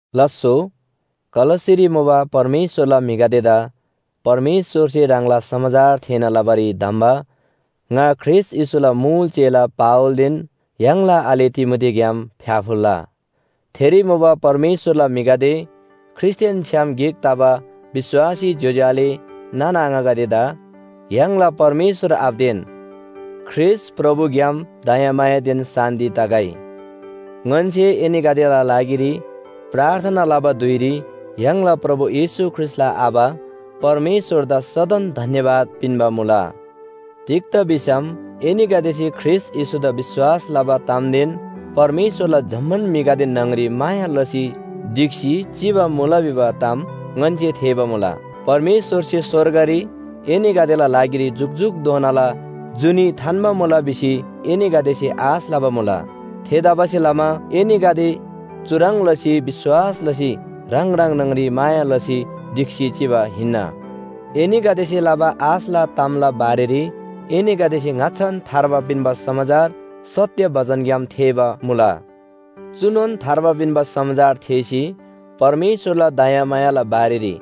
लास्‍सो, कलस्‍सेरी मुबा परमेश्‍वरला म्‍हिगदेदा परमेश्‍वरसे ह्राङला समाचार थेःना लबारी धम्‍बा ङा ख्रीष्‍ट येशूला मुल चेला पावलदेन य्‍हाङला आले तिमोथीग्‍याम फ्‍याफुल्‍ला! थेरी मुबा परमेश्‍वरला म्‍हिगदे ख्रीष्‍टदेन छ्‌याम गिक तबा विश्‍वासी ज्‍योज्‍यो आले नाना आङागदेदा य्‍हाङला परमेश्‍वर आबादेन ख्रीष्‍ट प्रभुग्‍याम दयामायादेन शान्‍ति तगै। ङन्‍से एनीगदेला लागिरी प्रार्थना लबा धुइरी य्‍हाङला प्रभु येशू ख्रीष्‍टला आबा परमेश्‍वरदा सदन धन्‍यवाद पिन्‍बा मुला। तिग्‍दा भिसम एनीगदेसे ख्रीष्‍ट येशूदा विश्‍वास लबा तामदेन परमेश्‍वरला जम्‍मान म्‍हिगदे न्‍हङरी माया लसी ढिक्‍सी चिबा मुला भिबा ताम ङन्‍से थेःबा मुला। परमेश्‍वरसे स्‍वर्गरी एनीगदेला लागिरी जुकजुकधोनाला जुनी थान्‍बा मुला भिसी एनीगदेसे आश लबा मुला। थेतबासेलमा एनीगदे चुह्रङ् लसी विश्‍वास लसी ह्राङ ह्राङ न्‍हङरी माया लसी ढिक्‍सी चिबा हिन्‍ना। एनीगदेसे लबा आशला तामला बारेरी एनीगदेसे ङाच्‍छान थार्बा पिन्‍बा समाचार सत्‍य बचनग्‍याम थेःबा मुला। चुनोन थार्बा पिन्‍बा समाचार थेःसी, परमेश्‍वरला दयामायाला बारेरी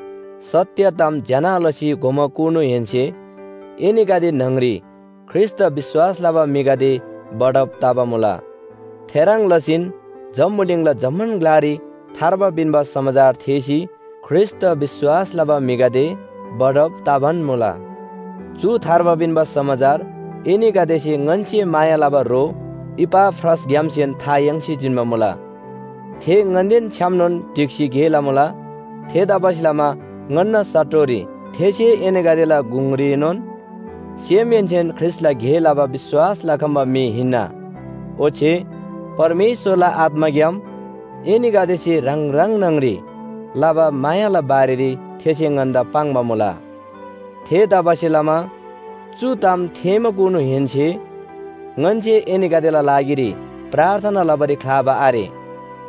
सत्‍य ताम ज्‍यना लसी घोमाकुनुहेन्‍से एनीगदे न्‍हङरी ख्रीष्‍टदा विश्‍वास लबा म्‍हिगदे बढब तबा मुला। थेह्रङ् लसीन जम्‍बुलिङला जम्‍मान ग्‍लारी थार्बा पिन्‍बा समाचार थेःसी ख्रीष्‍टदा विश्‍वास लबा म्‍हिगदे बढब तबान मुला। चु थार्बा पिन्‍बा समाचार एनीगदेसे ङन्‍से माया लबा ह्रो इपाफ्रासग्‍यामसेन था याङ्सी जिन्‍बा मुला। थे ङन्‍देन छ्‌यामनोन ढिक्‍सी गे लमुला। थेतबासेलमा ङन्‍ना साटोरी थेसे एनीगदेला गुङरीनोन सेमहेन्‍सेन ख्रीष्‍टला गे लबा विश्‍वास लखम्‍बा म्‍हि हिन्‍ना। ओच्‍छे परमेश्‍वरला आत्‍माग्‍याम एनीगदेसे ह्राङ ह्राङ न्‍हङरी लबा मायाला बारेरी थेसे ङन्‍दा पाङ्बा मुला। थेतबासेलमा चु ताम थेःमाकुनुहेन्‍से ङन्‍से एनीगदेला लागिरी प्रार्थना लबारी ख्‍लाबा आरे।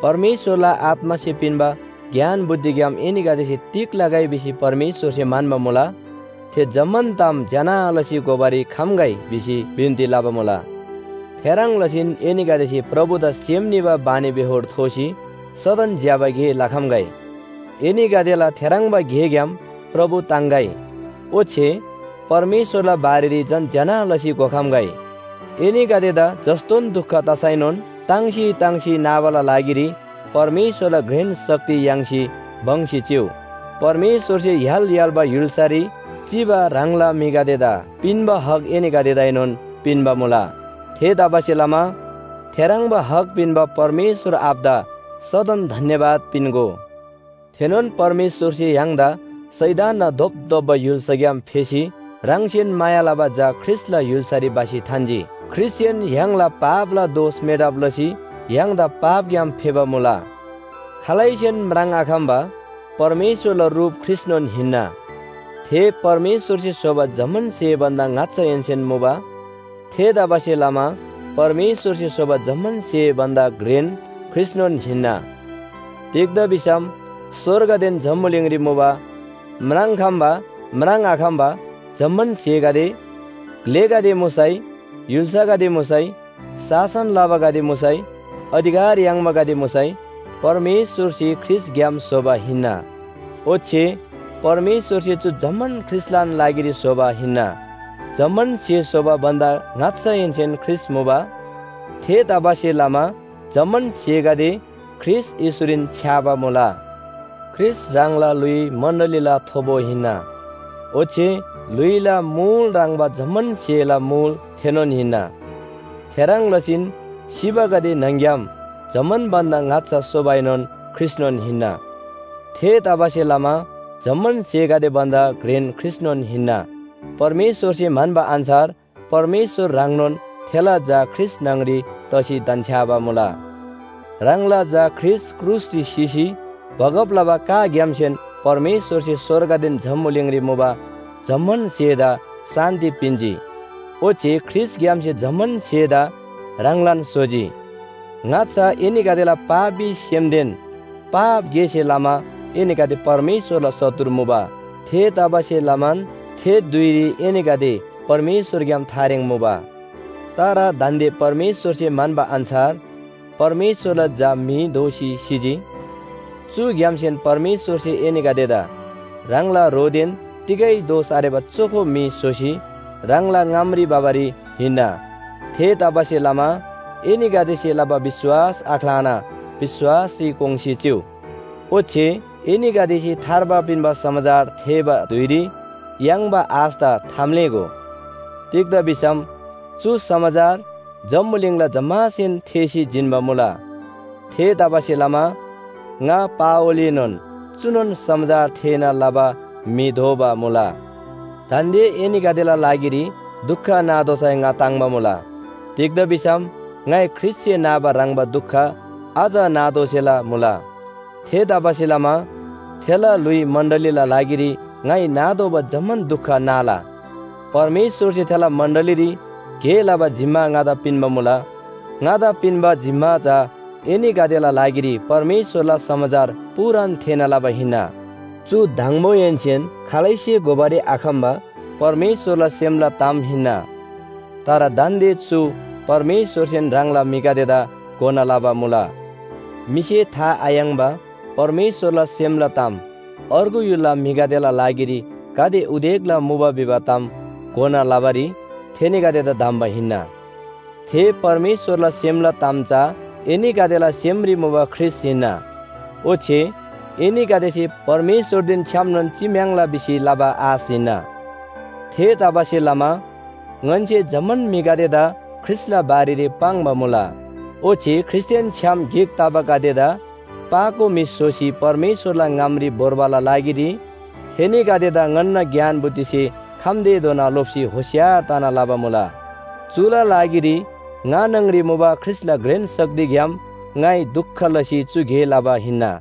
परमेश्‍वरला आत्‍मासे पिन्‍बा ज्ञान बुद्धिग्‍याम एनीगदेसे तिग लगै भिसी परमेश्‍वरसे म्‍हन्‍बा मुला, थे जम्‍मान ताम ज्‍यना लसी घोबारी खम्‍गै भिसी बिन्‍ती लबा मुला। थेह्रङ् लसीन एनीगदेसे प्रभुदा सेम निबा बानीबेहोर थोसी सदन ज्‍यबा गे लखम्‍गै। एनीगदेला थेह्रङ्बा गेग्‍याम प्रभु ताङ्‌गै। ओच्‍छे परमेश्‍वरला बारेरी झन ज्‍यना लसी घोखम्‍गै। एनीगदेदा जस्‍तोन दुख तसैनोन ताङ्सी ताङ्सी नाबाला लागिरी परमेश्‍वरला घ्रेन शक्ति याङ्सी भङ्‍सी चिउ। परमेश्‍वरसे य्‍हाल य्‍हाल्‍बा य्‍हुल्‍सारी चिबा ह्राङला म्‍हिगदेदा पिन्‍बा हक एनीगदेदाएनोन पिन्‍बा मुला। थेतबासेलमा थेह्रङ्बा हक पिन्‍बा परमेश्‍वर आबादा सदन धन्‍यवाद पिन्‍गो। थेनोन परमेश्‍वरसे य्‍हाङदा शैतानना धोपधोप्‍बा य्‍हुल्‍साग्‍याम फेसी ह्राङसेन माया लबा झा ख्रीष्‍टला य्‍हुल्‍सारी भसी थान्‍जी। ख्रीष्‍टसेन य्‍हाङला पापला दोष मेटब लसी य्‍हाङदा पापग्‍याम फेबा मुला। खालैसेन म्राङ्आखम्‍बा परमेश्‍वरला रुप ख्रीष्‍टनोन हिन्‍ना। थे परमेश्‍वरसे स्‍होबा जम्‍मान स्‍हे भन्‍दा ङाच्‍छाहेन्‍सेन मुबा। थेतबासेलमा परमेश्‍वरसे स्‍होबा जम्‍मान स्‍हे भन्‍दा घ्रेन ख्रीष्‍टनोन हिन्‍ना। तिग्‍दा भिसम स्‍वर्गदेन जम्‍बुलिङरी मुबा म्राङ्‌खम्‍बा म्राङ्आखम्‍बा जम्‍मान स्‍हेगदे, ग्‍लेगदे मुसै, य्‍हुल्‍सागदे मुसै, शासन लबागदे मुसै, अधिकार याङ्बागदे मुसै परमेश्‍वरसे ख्रीष्‍टग्‍याम स्‍होबा हिन्‍ना। ओच्‍छे परमेश्‍वरसे चु जम्‍मान ख्रीष्‍टलान लागिरी स्‍होबा हिन्‍ना। जम्‍मान स्‍हे स्‍होबा भन्‍दा ङाच्‍छाहेन्‍सेन ख्रीष्‍ट मुबा। थेतबासेलमा जम्‍मान स्‍हेगदे ख्रीष्‍ट येशूरीन छ्‌याबा मुला। ख्रीष्‍ट ह्राङला ल्‍हुइ मण्‍डलीला थोबो हिन्‍ना। ओच्‍छे ल्‍हुइला मुल ह्रङ्‌बा जम्‍मान स्‍हेला मुल थेनोन हिन्‍ना। थेह्रङ् लसीन सिबागदे न्‍हङ‍ग्‍याम जम्‍मान भन्‍दा ङाच्‍छा सोबाएनोन ख्रीष्‍टनोन हिन्‍ना। थेतबासेलमा जम्‍मान स्‍हेगदे भन्‍दा घ्रेन ख्रीष्‍टनोन हिन्‍ना। परमेश्‍वरसे म्‍हन्‍बा अन्‍छार परमेश्‍वर ह्राङनोन थेला झा ख्रीष्‍ट न्‍हङरी तसी धन्‍छ्‌याबा मुला। ह्राङला झा ख्रीष्‍ट क्रुसरी सिसी बगब लबा काग्‍यामसेन परमेश्‍वरसे स्‍वर्गदेन जम्‍बुलिङरी मुबा जम्‍मान स्‍हेदा शान्‍ति पिन्‍जी। ओच्‍छे ख्रीष्‍टग्‍यामसे जम्‍मान स्‍हेदा ह्राङलान स्‍होजी। ङाच्‍छा एनीगदेला पापी सेमदेन पाप गेसे लमा एनीगदे परमेश्‍वरला शत्रु मुबा। थेतबासेलमान थे धुइरी एनीगदे परमेश्‍वरग्‍याम थारेङ मुबा। तर दान्‍दे परमेश्‍वरसे म्‍हन्‍बा अन्‍छार परमेश्‍वरला झा म्‍हि दोसी सिजी। चुग्‍यामसेन परमेश्‍वरसे एनीगदेदा ह्राङला ह्रोदेन तिगै दोष आरेबा चोखो म्‍हि स्‍होसी ह्राङला ङामरी भबारी हिन्‍ना। थेतबासेलमा एनीगदेसे लबा विश्‍वास आख्‍लाना विश्‍वासरी कोङ्‌सी चिउ। ओच्‍छे एनीगदेसे थार्बा पिन्‍बा समाचार थेःबा धुइरी याङ्बा आशदा थाम्‍लेःगो। तिग्‍दा भिसम चु समाचार जम्‍बुलिङला जम्‍मासेन थेःसी जिन्‍बा मुला। थेतबासेलमा ङा पावलएनोन चुनोन समाचार थेःना लबा म्‍हि दोबा मुला। दान्‍दे एनीगदेला लागिरी दुख नातोःसै ङा ताङ्‍बा मुला। तिग्‍दा भिसम ङाइ ख्रीष्‍टसे नाबा ह्रङ्‌बा दुख अझ नातोःसेला मुला। थेतबासेलमा थेला ल्‍हुइ मण्‍डलीला लागिरी ङाइ नातोःबा जम्‍मान दुख नाला। परमेश्‍वरसे थेला मण्‍डलीरी गे लबा जिम्‍मा ङादा पिन्‍बा मुला। ङादा पिन्‍बा जिम्‍मा चा एनीगदेला लागिरी परमेश्‍वरला समाचार पूरान थेःना लबा हिन्‍ना। चु दङबोहेन्‍सेन खालैसे घोबारी आखम्‍बा परमेश्‍वरला सेमला ताम हिन्‍ना। तर दान्‍दे चु परमेश्‍वरसेन ह्राङला म्‍हिगदेदा घोना लबा मुला। म्‍हिसे था आयाङ्‍बा परमेश्‍वरला सेमला ताम अर्गु य्‍हुलला म्‍हिगदेला लागिरी गाते उदेकला मुबा भिबा ताम घोना लबारी थेनीगदेदा धम्‍बा हिन्‍ना। थे परमेश्‍वरला सेमला ताम चा एनीगदेला सेमरी मुबा ख्रीष्‍ट हिन्‍ना। ओच्‍छे एनीगदेसे परमेश्‍वरदेन छ्‌यामनोन चिम्‍याङ्ला भिसी लबा आश हिन्‍ना। थेतबासेलमा ङन्‍से जम्‍मान म्‍हिगदेदा ख्रीष्‍टला बारेरी पाङ्बा मुला। ओच्‍छे ख्रीष्‍टदेन छ्‌याम गिक तबागदेदा पाको म्‍हि स्‍होसी परमेश्‍वरला ङामरी भोर्बाला लागिरी थेनीगदेदा ङन्‍ना ज्ञान बुद्धिसे खम्‍तेधोना लोप्‍सी होशियार तना लबा मुला। चुला लागिरी ङा न्‍हङरी मुबा ख्रीष्‍टला घ्रेन शक्तिग्‍याम ङाइ दुख लसी चु गे लबा हिन्‍ना।